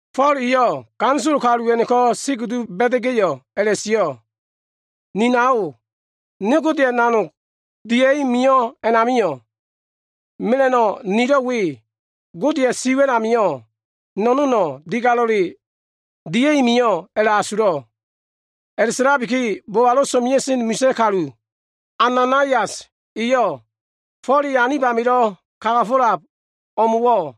Fo꞉l eyo꞉ ganisolo kalu a꞉no꞉ko꞉ si kudu ba꞉da꞉ga꞉yo꞉ a꞉la꞉sio꞉, “Ni nao, ne Godeya꞉ nanog dimida꞉i mio꞉ a꞉namio꞉ mela꞉no꞉ nilo꞉ we, Godeya꞉ siwa꞉l amio꞉ no꞉no꞉no꞉ digalo꞉le dimida꞉i mio꞉ a꞉la꞉asulo꞉l.” A꞉la꞉sa꞉labiki, bobalo꞉ so꞉mea꞉sen misa꞉ kalu, Ananaias eyo꞉ Fo꞉l e anib amilo꞉ kagafo꞉lab o꞉mo꞉wo꞉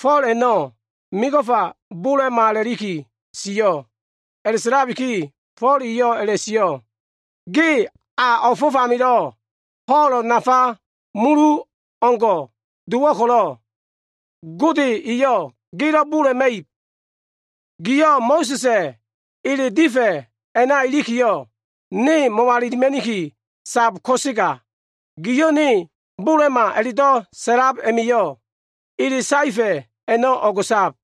Fo꞉l a꞉no꞉ mego꞉fa bola꞉ma a꞉la꞉liki sio꞉. A꞉la꞉sa꞉labiki Fo꞉l eyo꞉ a꞉la꞉sio꞉, “Ge a o꞉fo꞉f amilo꞉ ho꞉lo꞉ nafa mulu o꞉leo꞉ngo꞉ dowo꞉ ko꞉lo꞉ Gode eyo꞉ gelo꞉ bola꞉la꞉ma꞉ib. Gio꞉ Mo꞉sa꞉sa꞉ ele difa꞉ a꞉na ilikiyo꞉ ne mo꞉walilima꞉niki sab ko꞉sega, giyo꞉ ne bola꞉ma a꞉la꞉do꞉ sa꞉lab a꞉ma꞉yo꞉ ele saefa꞉ a꞉no꞉ o꞉go꞉sab.”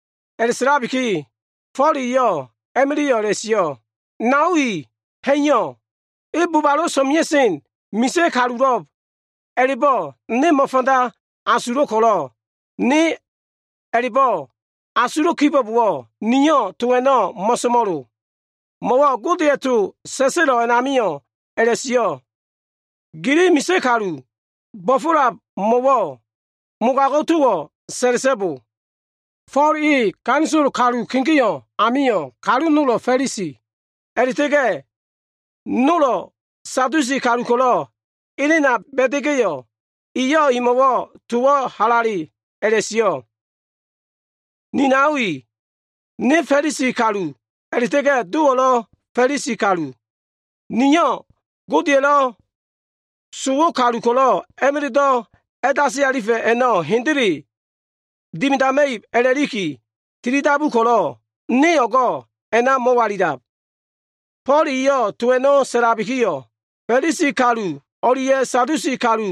A꞉la꞉sa꞉labiki, Fo꞉l eyo꞉ a꞉ma꞉la꞉yo꞉ a꞉la꞉sio꞉, “Nao i ha꞉iyo꞉. E bobalo꞉ so꞉mea꞉sen misa꞉ kalulo꞉b a꞉la꞉bo꞉ ne mo꞉fanda asulo꞉ ko꞉lo꞉, ne a꞉la꞉bo꞉ asulo꞉ kibo꞉bowo꞉, niyo꞉ to a꞉no꞉ mo꞉so꞉mo꞉lo. Mo꞉wo꞉ Godeya꞉ to sa꞉sa꞉lo꞉ amio꞉ a꞉la꞉sio꞉, ‘Misa꞉ kalu gilo꞉ bo꞉fo꞉lab imo꞉wo꞉ mogago꞉ towo꞉ sa꞉la꞉so꞉bo.’” Fo꞉l e ganisolo kalu kegeo꞉ us a꞉namio꞉, kalu nolo꞉ Fa꞉lisi a꞉la꞉ta꞉ga꞉ nolo꞉ Sadusi kalu ko꞉lo꞉ elena ba꞉da꞉ga꞉yo꞉, eyo꞉ imo꞉wo꞉ towo꞉ halale sa꞉lakiyo꞉, “Ni nao i, ne Fa꞉lisi kalu a꞉la꞉ta꞉ga꞉ dowo꞉lo꞉ Fa꞉lisi kalu. Niyo꞉ Godeya꞉lo꞉ sowo꞉ kalu ko꞉lo꞉ a꞉ma꞉la꞉do꞉ a꞉dasi alifa꞉ib a꞉no꞉ hendele dimidama꞉ib a꞉la꞉liki tilidabu ko꞉lo꞉, ne o꞉go꞉ a꞉na mo꞉walilab.” Fo꞉l eyo꞉ to a꞉no꞉ sa꞉labikiyo꞉, Fa꞉lisi kalu o꞉lia꞉ Sadusi kalu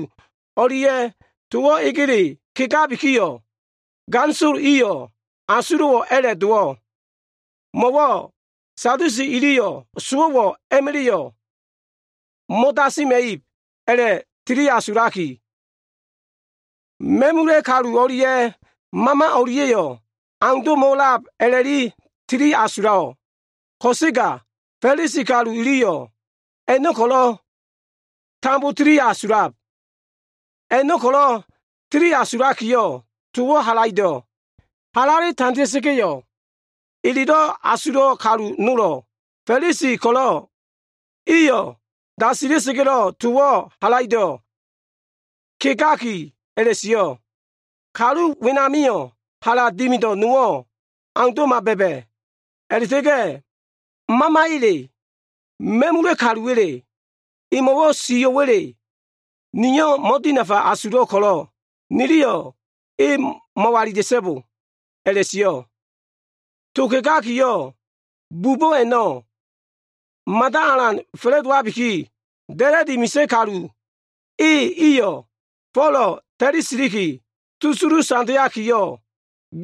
o꞉lia꞉yo꞉ towo꞉ egele kegakiyo꞉, ganisolo iyo꞉ asulo꞉wo꞉ a꞉la꞉ dowo꞉. Mo꞉wo꞉ Sadusi iliyo꞉ sowo꞉wo꞉ a꞉ma꞉la꞉yo꞉ mo꞉dasima꞉ib a꞉la꞉tiliasulaki, ma꞉mula꞉ kalu o꞉lia꞉ mama o꞉lia꞉yo꞉ aundo꞉mo꞉ a꞉lab a꞉la꞉tili asulo꞉. Ko꞉sega Fa꞉lisi kalu iliyo꞉ man a꞉no꞉ ko꞉lo꞉ tambo tili asulab. A꞉no꞉ ko꞉lo꞉ tili asulakiyo꞉, towo꞉ halaido꞉ halale tandea꞉sa꞉ga꞉yo꞉, elelo꞉ wida꞉sen kalu nolo꞉, Fa꞉lisi ko꞉lo꞉ iyo꞉ dasila꞉sa꞉ga꞉ towo꞉ halaido꞉ kegaki a꞉la꞉sio꞉, “Kalu wenamio꞉ hala dimido꞉ nowo꞉ aundo꞉ma ba꞉ba꞉. A꞉la꞉ta꞉ga꞉ mamaya꞉le, ma꞉mula꞉ kaluwa꞉le, emo꞉wo꞉ sio꞉wa꞉le nio꞉ mo꞉dinafa asulo꞉ ko꞉lo꞉ niliyo꞉ e mo꞉walila꞉so꞉bo” a꞉la꞉sio꞉. To kegakiyo꞉ bubo꞉ a꞉no꞉ mada alan fa꞉la꞉dowabikiyo꞉, da꞉la꞉di misa꞉ kalu e iyo꞉ Folo꞉ ta꞉li siliki susulu tandeakiyo꞉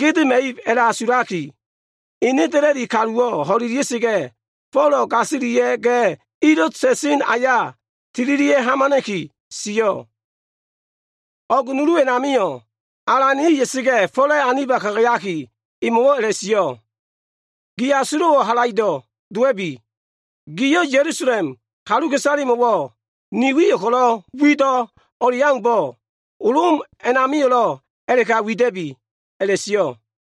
gedema꞉ib a꞉la꞉kele asulaki, ene da꞉la꞉di kaluwo꞉ ho꞉ida꞉sa꞉ga꞉, Fo꞉lo꞉ gasilia꞉ga꞉ ilo꞉ sa꞉sen aya tililia꞉ hamana꞉ki sio꞉. O꞉g nulu a꞉namio꞉, Alan e ya꞉sa꞉ga꞉, Fo꞉la꞉ aniba kagayaki, emo꞉wo꞉ a꞉la꞉sio꞉, “Gi asulo꞉wo꞉ halaido꞉ dowa꞉bi. Giyo꞉ Ya꞉lusalem kaluka꞉isalemo꞉wo꞉ ni wi ko꞉lo꞉ wido꞉ o꞉leaumbo꞉, Lom a꞉namio꞉lo꞉ a꞉la꞉ka wida꞉bi” a꞉la꞉sio꞉.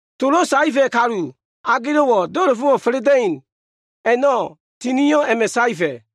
Tolo꞉ saefa꞉ kalu agelo꞉wo꞉ do꞉la꞉fo꞉ fa꞉la꞉da꞉in a꞉no꞉ tinio꞉ a꞉ma꞉ saefa꞉.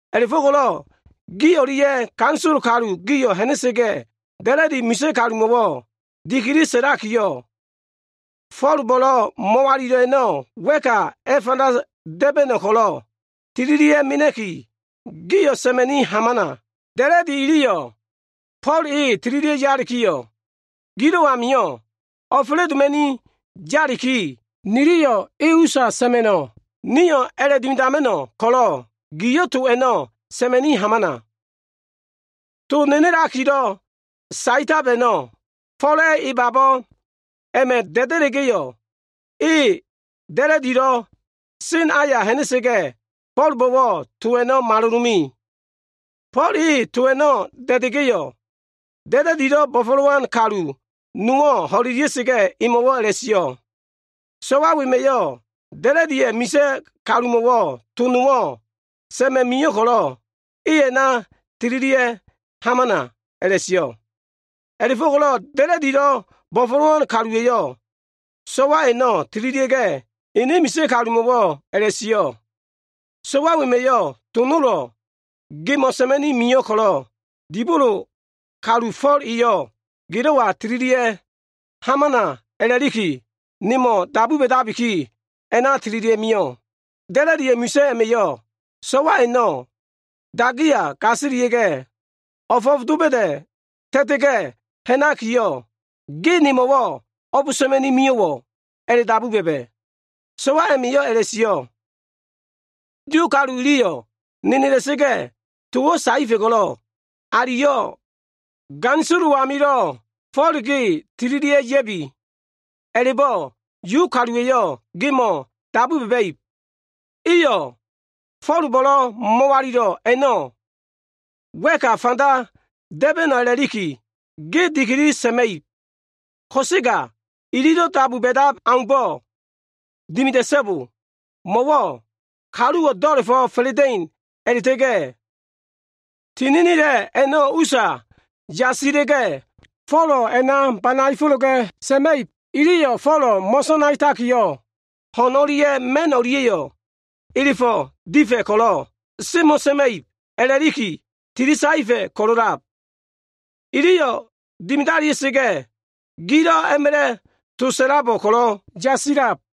A꞉la꞉fo꞉ko꞉lo꞉ gi o꞉lia꞉ ganisolo kalu gio꞉ ha꞉na꞉sa꞉ga꞉, da꞉la꞉di misa꞉ kalumo꞉wo꞉ dikili sa꞉lakiyo꞉, Fo꞉lbo꞉lo꞉ mo꞉walilo꞉ a꞉no꞉ wa꞉ka a꞉fanda da꞉ba꞉no꞉ ko꞉lo꞉ tililia꞉ mena꞉ki, gio꞉ sa꞉ma꞉ni hamana. Da꞉la꞉di iliyo꞉ Fo꞉l e tililia꞉ yalikiyo꞉, gilo꞉ amio꞉ o꞉fa꞉la꞉doma꞉ni yaliki, niliyo꞉ e usa sa꞉ma꞉no꞉. Nio꞉ a꞉la꞉dimidama꞉no꞉ ko꞉lo꞉ gio꞉ to a꞉no꞉ sa꞉ma꞉ni hamana.” To nenelakilo꞉ saetab a꞉no꞉, Fo꞉la꞉ e babo꞉ a꞉ma꞉ da꞉da꞉la꞉ga꞉yo꞉, e da꞉la꞉dilo꞉ sa꞉sen aya ha꞉na꞉ga꞉, Fo꞉lbo꞉wo꞉ to a꞉no꞉ malolome. Fo꞉l e to a꞉no꞉ da꞉da꞉ga꞉yo꞉, da꞉la꞉dilo꞉ bo꞉fo꞉lowan kalu nowo꞉ ho꞉lelia꞉sa꞉ga꞉, emo꞉wo꞉ a꞉la꞉sio꞉, “So꞉wa wema꞉yo꞉ da꞉la꞉diya꞉ misa꞉ kalumo꞉wo꞉ to nowo꞉ sa꞉ma꞉ mio꞉ ko꞉lo꞉ e a꞉na tililia꞉ hamana” a꞉la꞉sio꞉. A꞉la꞉fo꞉ko꞉lo꞉ da꞉la꞉dilo꞉ bo꞉fo꞉lowan kaluwa꞉yo꞉ so꞉wa a꞉no꞉ tililia꞉ga꞉, ene misa꞉ kalumo꞉wo꞉ a꞉la꞉sio꞉, “So꞉wa wema꞉yo꞉ to nolo꞉ gemo꞉ sa꞉ma꞉ni mio꞉ ko꞉lo꞉ dibolo kalu Fo꞉l eyo꞉ gelo꞉wa tililia꞉ hamana a꞉la꞉liki, nemo꞉ dabu ba꞉dabiki, a꞉na tililia꞉ mio꞉.” Da꞉la꞉diya꞉ misa꞉ a꞉ma꞉yo꞉ so꞉wa a꞉no꞉ dagiya gasilia꞉ga꞉, o꞉fo꞉f doba꞉da꞉ ta꞉ta꞉ga꞉ ha꞉nakiyo꞉, “Ge nemo꞉wo꞉ o꞉b sa꞉ma꞉ni mio꞉wo꞉?” a꞉la꞉dabu ba꞉ba꞉. So꞉wa a꞉ma꞉yo꞉ a꞉la꞉sio꞉, “Yu kalu iliyo꞉ nenela꞉sa꞉ga꞉ towo꞉ saefa꞉ ko꞉lo꞉ aliyo꞉ ganisololo꞉ amio꞉ Folo꞉ ge tililia꞉ ya꞉bi a꞉la꞉bo꞉ Yu kaluwa꞉yo꞉ gemo꞉wo꞉ dabu ba꞉ba꞉ib. Iyo꞉ Fo꞉lbo꞉lo꞉ mo꞉walilo꞉ a꞉no꞉ wa꞉ka a꞉fanda da꞉ba꞉no꞉ a꞉la꞉likiyo꞉ ge dikili sa꞉ma꞉ib. Ko꞉sega ililo꞉ dabu ba꞉dab aumbo꞉ dimida꞉so꞉bo. Mo꞉wo꞉ kaluwo꞉ do꞉la꞉fo꞉ fa꞉la꞉da꞉in a꞉la꞉ta꞉ga꞉ tininila꞉ a꞉no꞉ usa yasila꞉ga꞉, Folo꞉ a꞉na banaefo꞉la꞉ga꞉ sa꞉ma꞉ib. Iliyo꞉ Folo꞉ mo꞉sanaetakiyo꞉, ho꞉n o꞉lia꞉ ma꞉n o꞉lia꞉yo꞉ elefo꞉ difa꞉ ko꞉lo꞉ semo꞉ma꞉ib a꞉la꞉liki tili saefa꞉ ko꞉lo꞉lab. Iyo꞉ dimidalia꞉sa꞉ga꞉, gilo꞉ a꞉ma꞉la꞉ to sa꞉labo꞉ ko꞉lo꞉ yasilab.”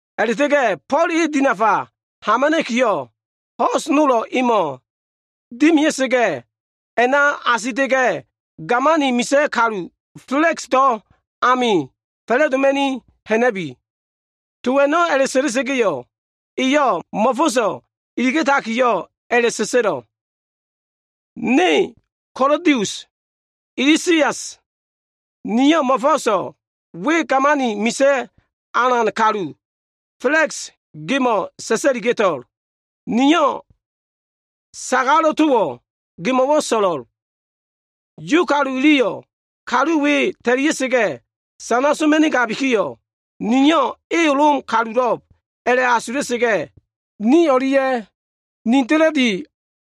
A꞉la꞉ta꞉ga꞉ Fo꞉l e dinafa hamana꞉kiyo꞉, ho꞉s nolo꞉ emo꞉ dimia꞉sa꞉ga꞉, a꞉na asita꞉ga꞉, gamani misa꞉ kalu, Fela꞉ksdo꞉ amio꞉ fa꞉la꞉doma꞉ ha꞉na꞉bi.” To a꞉no꞉ sa꞉la꞉sa꞉ga꞉yo꞉, eyo꞉ mo꞉fo꞉so꞉ iliga꞉takiyo꞉ a꞉la꞉sa꞉sa꞉lo꞉. Ne Kalodius Lisias, niyo꞉ mo꞉fo꞉so꞉ we gamani misa꞉ alan kalu Fela꞉ks gemo꞉ sa꞉sa꞉liga꞉to꞉l. Niyo꞉ sagalo꞉ towo꞉ gemo꞉wo꞉ so꞉lo꞉l. Yu kalu iliyo꞉ kalu we ta꞉lia꞉sa꞉ga꞉ sana soma꞉nigabikiyo꞉, niyo꞉ e Lom kalulo꞉b a꞉la꞉asula꞉sa꞉ga꞉, ne o꞉lia꞉ ni da꞉la꞉di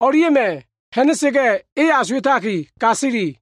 kalu o꞉lia꞉yo꞉ ha꞉na꞉sa꞉ga꞉, e asuwa꞉taki gasili.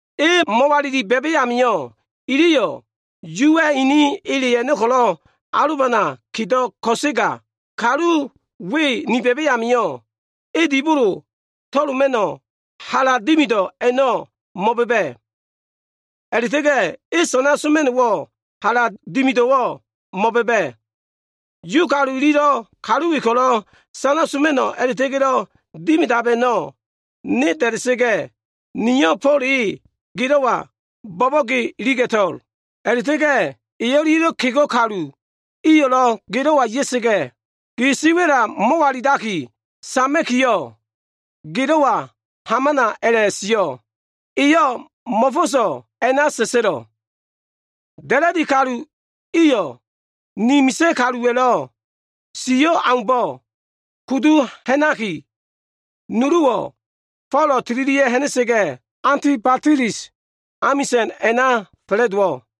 E mo꞉walili ba꞉ba꞉ amio꞉, iliyo꞉ Yuwa꞉ ini ele a꞉no꞉ ko꞉lo꞉ alobana kedo꞉ ko꞉sega, kalu we ni ba꞉ba꞉ amio꞉, e dibolo amilo꞉ to꞉loma꞉no꞉ hala dimido꞉ nowo꞉ mo꞉ba꞉ba꞉. A꞉la꞉ta꞉ga꞉ elo꞉ sana soma꞉no꞉ hala dimido꞉ nowo꞉lo꞉ mo꞉ba꞉ba꞉. Yu kalu ililo꞉ kalu we ko꞉lo꞉ sana soma꞉no꞉ a꞉la꞉ta꞉ga꞉lo꞉ dimidaitab a꞉no꞉ ne da꞉da꞉sa꞉ga꞉, niyo꞉ Fo꞉l e gelo꞉wa bo꞉bo꞉ge iliga꞉to꞉l. A꞉la꞉ta꞉ga꞉ e o꞉lia꞉lo꞉ kego꞉ kalu iyo꞉lo꞉ gelo꞉wa ya꞉sa꞉ga꞉, gi siwa꞉la mo꞉walilaki sama꞉kiyo꞉, gelo꞉wa hamana a꞉la꞉sio꞉. Eyo꞉ mo꞉fo꞉so꞉ a꞉la꞉sa꞉sa꞉lo꞉. Da꞉la꞉di kalu iyo꞉, ini misa꞉ kaluwa꞉lo꞉ sio꞉ aumbo꞉ kudu ha꞉naki, nuluwo꞉ Fo꞉lo꞉ tililia꞉ ha꞉na꞉sa꞉ga꞉ Antibatilis amisa꞉n a꞉na fa꞉la꞉dowo꞉.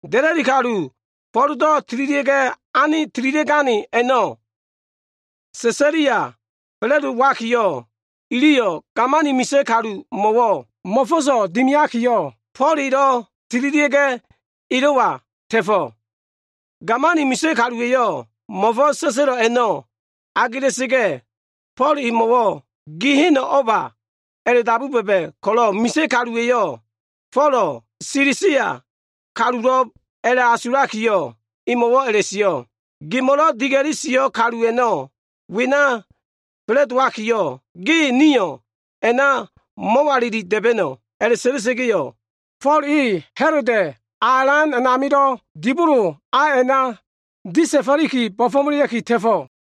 Da꞉la꞉di kalu Fo꞉ldo꞉ tililia꞉gane a꞉no꞉ Sesalia fa꞉la꞉dowakiyo꞉, iliyo꞉ gamani misa꞉ kalumo꞉wo꞉ mo꞉fo꞉so꞉ dimiakiyo꞉, Fo꞉l elo꞉ tililia꞉ga꞉ elo꞉wa ta꞉fo꞉. Gamani misa꞉ kaluwa꞉yo꞉ mo꞉fo꞉s sa꞉sa꞉lo꞉ a꞉no꞉ agela꞉sa꞉ga꞉, Fo꞉l emo꞉wo꞉, “Gi heno꞉ o꞉ba?” a꞉la꞉dabu ba꞉ba꞉ ko꞉lo꞉ misa꞉ kaluwa꞉yo꞉ Folo꞉ Silisia kalulo꞉b a꞉la꞉asulakiyo꞉, emo꞉wo꞉ a꞉la꞉sio꞉, “Gemo꞉lo꞉ diga꞉li sio꞉ kalu a꞉no꞉ wena fa꞉la꞉dowalikiyo꞉, ge nio꞉ a꞉na mo꞉walili da꞉ba꞉no꞉.” A꞉la꞉sa꞉la꞉sa꞉ga꞉yo꞉, Fo꞉l e Ha꞉loda꞉ a alan a꞉namilo꞉ dibolo a a꞉na disalifo꞉liki, bo꞉fo꞉melea꞉ki ta꞉fo꞉.